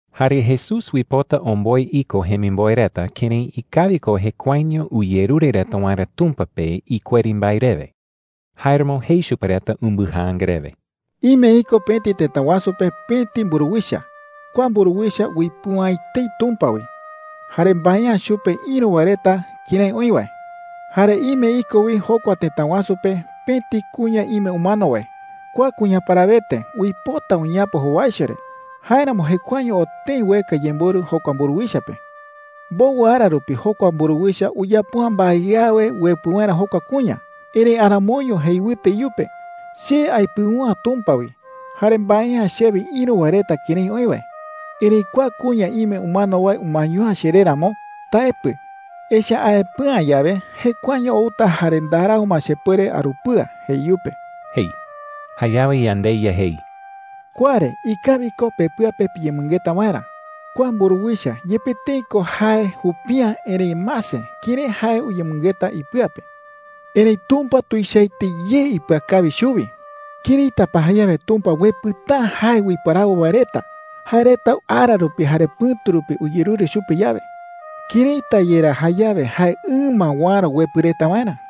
Jare Jesús uipota omboe iko jemimboe reta kërái ikawi ko jekuaeño uyerure reta waerä Tumpa pe ikueri mbae rewe. Jáeramo jei chupe reta umbɨjaanga rewe: “Ime iko pëti tëta wasu pe pëti mburuwicha. Kua mburuwicha uipɨu’ä etei Tumpa wi, jare mbae’ä chupe ïru wae reta kërái oï wae,” jei. “Jare ime iko wi jokua tëta wasu pe pëti kuña ime umano wae. Kua kuña parawete uipota uñeapo jowaicho re. Jáeramo jekuaeño oo tëi ueka yemborɨ jokua mburuwicha pe,” jei chupe reta. “Mbowɨ ara rupi jokua mburuwicha uyapo’ä mbae awe uepɨ waerä jokua kuña. Erëi aramoiño jei wɨte iyupe: ‘Che aipɨu’ä Tumpa wi, jare mbae’ä chewe ïru wae reta kërái oï wae. Erëi kua kuña ime umano wae umaeño’ä cheré ramo, taepɨ. Echa’ä aepɨ'ä yawe, jekuaeño outa jare ndarau ma chepuere arupɨa,’ jei iyupe,” jei. Jayawe yandeYa jei: “Kua re ikawi ko pepɨa pe piyemɨngeta waerä. Kua mburuwicha, yepe tëi ko jae jupi’ä, erëi mase kërái jae uyemɨngeta ipɨa pe,” jei. “Erëi Tumpa tuichaete ye ipɨakawi chuwi. ¿Këraita pa jayawe Tumpa uepɨta’ä jae uiparawo wae reta, jae reta ara rupi jare pɨ̈tu rupi uyerure chupe yawe? ¿Këraita yerá jayawe jae ɨma uäro uepɨ reta waerä?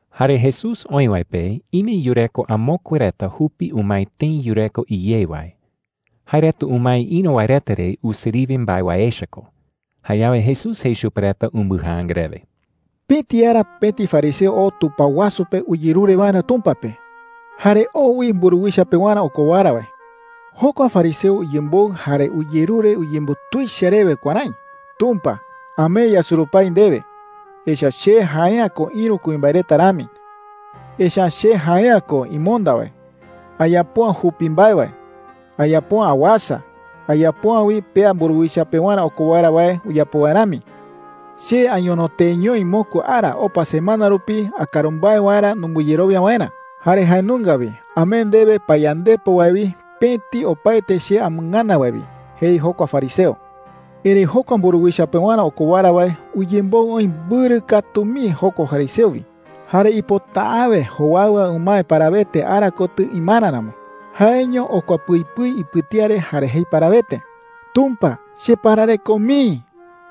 Jare Jesús oï wae pe ime yureko amokue reta jupi umae tëi yureko iyé wae. Jae reta umae ïru wae reta re usiriwe mbae wae echa ko. Jayawe Jesús jei chupe reta umbɨjaanga rewe: “Pëti ara pëti fariseo oo tupao wasu pe uyerure waerä Tumpa pe. Jare oo wi mburuwicha pewarä okowara wae,” jei. “Jokua fariseo uyemboɨ jare uyerure uyembutuicha rewe kuärái: ‘Tumpa, amee yasurupái ndewe. Echa’ä che jae’ä ko ïru kuimbae reta rami. Echa’ä che jae’ä ko imonda wae. Ayapo’ä jupi mbae wae. Ayapo’ä awasa. Ayapo’ä wi pea mburuwicha pewarä okowara wae uyapo wae rami. Che añono teeñoi mokui ara opa semana rupi akaru mbae waerä numbɨyerowia waerä. Jare jae nunga wi amee ndewe payandepo wae wi pëti opaete che amɨngana wae wi,’ jei jokua fariseo. “Erëi jokua mburuwicha pewarä okowara wae uyemboɨ oï mbɨrɨ katu mii jokua fariseo wi, jare uipota’äwe jowaɨwa umae parawete ara kotɨ imara ramo. Jaeño okua pɨi pɨi ipɨtía re jare jei parawete: ‘Tumpa, cheparareko mii.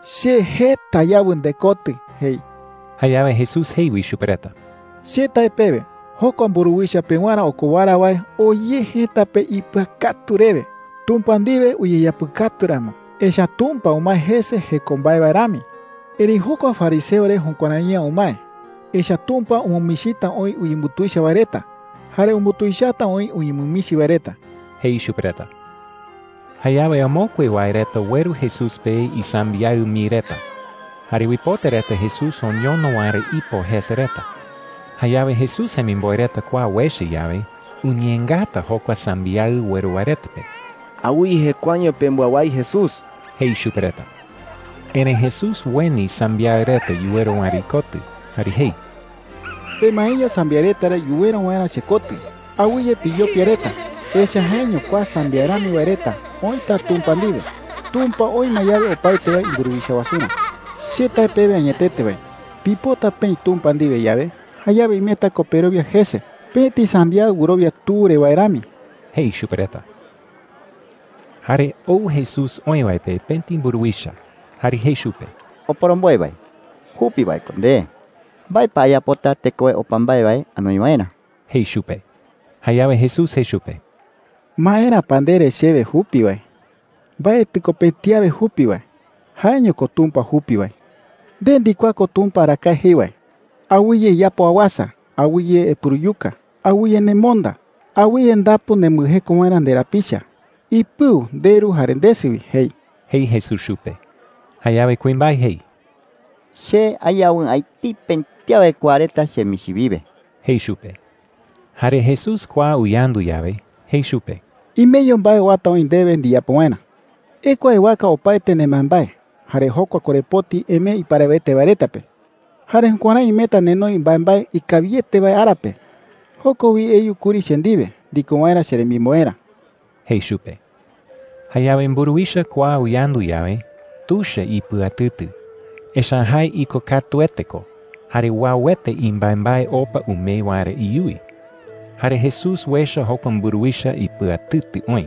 Che jeta ayawɨ ndekotɨ,’ jei.” Jayawe Jesús jei wi chupe reta: “Che tae pewe, jokua mburuwicha pewarä okowara wae oo ye jëta pe ipɨakatu rewe, Tumpa ndiwe uyeapɨkatu ramo. Echa’ä Tumpa umae jese jeko mbae wae rami,” jei. “Erëi jokua fariseo re jukuärai’ä umae. Echa’ä Tumpa umɨmichita oï uyembutuicha wae reta, jare umbutuichata oï uñemɨmichi wae reta,” jei chupe reta. Jayawe amokue wae reta ueru Jesús pe isambiaɨ mii reta, jare uipota reta Jesús oñono waerä ipo jese reta. Jayawe Jesús jemimboe reta kua uecha yawe, uñeengata jokua sambiaɨ ueru wae reta pe. “Awɨye jekuaeño pembɨawái Jesús,” jei chupe reta. Erëi Jesús ueni sambiaɨ reta yuweru waerä ikotɨ jare jei: “Pemaeño sambiaɨ reta re yuweru waerä chekotɨ. Awɨye piyopia reta, echa’ä jaeño kua sambiaɨ rami wae reta oïta Tumpa ndiwe, Tumpa oï ma yawe opaete wae imburuwicha wasurä,” jei chupe reta. “Che tae pewe añetete wae, pipota peï Tumpa ndiwe yawe, jayawe imeta ko perowia jese pëti sambiaɨ wɨrowia tu re wae rami,” jei chupe reta. Jare ou Jesús oï wae pe pëti mburuwicha, jare jei chupe: “Oporomboe wae, jupi wae ko nde. ¿Mbae pa ayapota tekowe opa mbae wae anoi waerä?” jei chupe. Jayawe Jesús jei chupe: “¿Maera pa ndere chewe jupi wae? Mbaetɨ ko pëti awe jupi wae. Jaeño ko Tumpa jupi wae,” jei. “Nde ndikuaa ko Tumpa arakae jei wae: ‘Awɨye iyapo awasa. Awɨye epuruyuka. Awɨye nemonda. Awɨye ndapu nembɨjeko waerä nderapicha. Ipɨu nderu jare ndesɨ wi,’ jei,” jei Jesús chupe. Jayawe kuimbae jei: “Che ayawɨ'ä etei pëti awe kua reta chemichi wiwe,” jei chupe. Jare Jesús kua uyandu yawe, jei chupe: “Imeño mbae uata oï ndewe ndiyapo waerä,” jei chupe. “Ekua ewaka opaete nembaembae, jare jokua korepoti emee iparawete wae reta pe. Jare jukuärái imeta nenoi mbaembae ikawiete wae ara pe. Joko wi eyu kuri che ndiwe ndiko waerä cheremimboerä,” jei chupe. Jayawe mburuwicha kua uyandu yawe, tuicha ipɨatɨtɨ. Echa’ä jae ikokatuete ko jare uauete imbaembae opa umee waerä iyuwi. Jare Jesús uecha jokua mburuwicha ipɨatɨtɨ oï,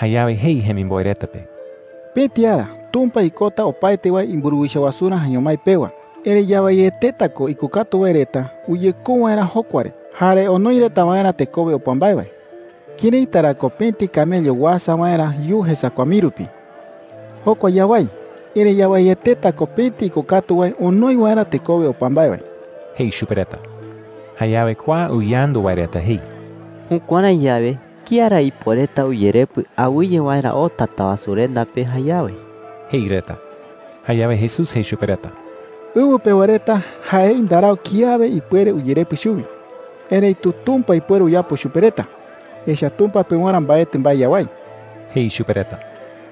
jayawe jei jemimboe reta pe: “Pëti ara Tumpa ikota opaete wae imburuwicha wasurä jaeño mái pewa. Erëi yawaieteta ko ikokatu wae reta uyekou waerä jokua re jare onoi reta waerä tekowe opa mbae wae,” jei chupe reta. “¿Këraita ra ko pëti camello Pëti camello tuichaete kawayu wi. uasa waerä yuu jesakua mii rupi? Jokua yawái. Erëi yawaieteta ko pëti ikokatu wae onoi waerä tekowe opa mbae wae,” jei chupe reta. Jayawe kua uyandu wae reta jei: “Jukuärái yawe, ¿kía ra ipuereta uyerepɨ awɨye waerä oo Tatawasurenda pe jayawe?” jei reta. Jayawe Jesús jei chupe reta: “Ɨwɨ pewa reta jaei ndarau kiawe ipuere uyerepɨ chuwi. Erëitu Tumpa ipuere uyapo chupe reta, echa’ä Tumpa pewarä mbaetɨ mbae yawái,” jei chupe reta.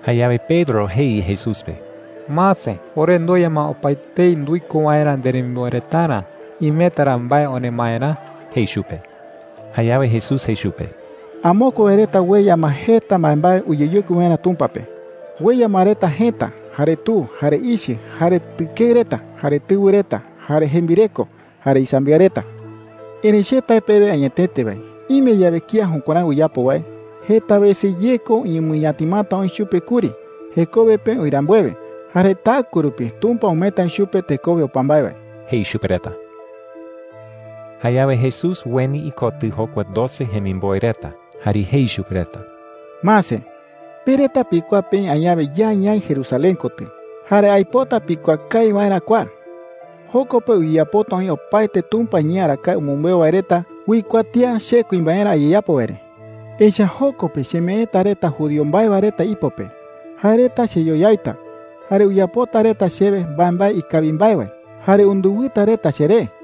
Jayawe Pedro jei Jesús pe: “Mase, ore ndueya ma opaetei nduiko waerä nderemimboe retarä. ¿Imeta ra mbae oremaerä?” jei chupe. Jayawe Jesús jei chupe: “Amokue wae reta ueya ma jeta mbaembae uyeyokui waerä Tumpa pe,” jei. “Ueya ma reta jëta, jare tu, jare ichɨ, jare tɨkeɨ reta, jare tɨwɨ reta, jare jembireko, jare isambiaɨ reta,” jei. “Erëi che tae pewe añetete wae, ime yawe kía jukuärái uyapo wae, jeta wese ye ko uñemɨñatimata oï chupe kuri jekowe pe oï rambuewe. Jare taɨkue rupi Tumpa umeeta oï chupe tekowe opa mbae wae,” jei chupe reta. Jayawe Jesús ueni ikotɨ jokua doce jemimboe reta jare jei chupe reta: “Mase, pe reta pikuaa peï añawe ya ñaï Jerusalén kotɨ. Jare aipota pikuaa kawi waerä kua: Joko pe uyeyapota oï opaete Tumpa iñee arakae umɨmbeu wae reta uikuatía che kuimbaerä ayeyapo wae re,” jei. “Echa’ä joko pe chemeeta reta judío mbae wae reta ipo pe. Jae reta cheyoyaita, jare uyapota reta chewe mbaembae ikawi mbae wae, jare undɨwɨta reta cheré,” jei.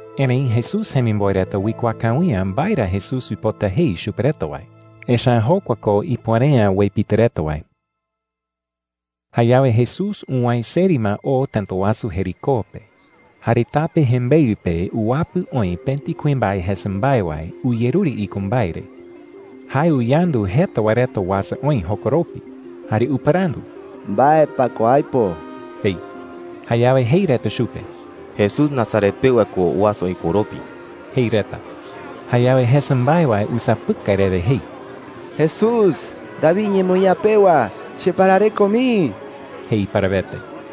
Erëi Jesús jemimboe reta uikuaa kawi’ä mbae ra Jesús uipota jei chupe reta wae. Echa’ä jokua ko ipuere’ä uepitɨ reta wae. Jayawe Jesús uwäe seri ma oo tëta wasu Jericó pe. Jare tape jembeɨ pe uwapɨ oï pëti kuimbae jesa mbae wae uyerure iko mbae re. Jae uyandu jeta wae reta uasa oï jokoropi, jare upɨrandu: “¿Mbae pa ko aipo?” jei. Jayawe jei reta chupe: “Jesús Nazaret pewa ko uasa oï koropi,” jei reta. Jayawe jesa mbae wae usapɨkai rewe jei: “¡Jesús, David iñemoñaa pewa, cheparareko mii!” jei parawete.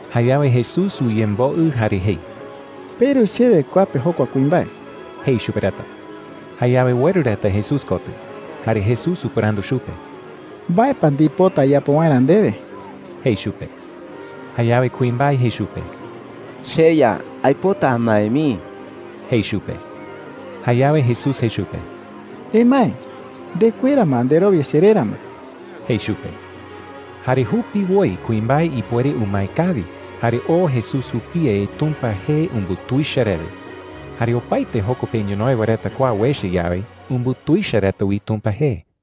Jayawe Jesús uyemboɨ jare jei: “Peru chewe kua pe jokua kuimbae,” jei chupe reta. Jayawe ueru reta Jesús kotɨ, jare Jesús upɨrandu chupe: “¿Mbae pa ndipota ayapo waerä ndewe?” jei chupe. Jayawe kuimbae jei chupe: “CheYa, aipota amae mii,” jei chupe. Jayawe Jesús jei chupe: “Emae. Ndekuera ma nderowia cheré ramo,” jei chupe. Jare jupiwoi kuimbae ipuere umae kawi, jare oo Jesús jupie Tumpa jee umbutuicha rewe. Jare opaete joko pe ñonoï wae reta kua uecha yawe, umbutuicha reta wi Tumpa jee.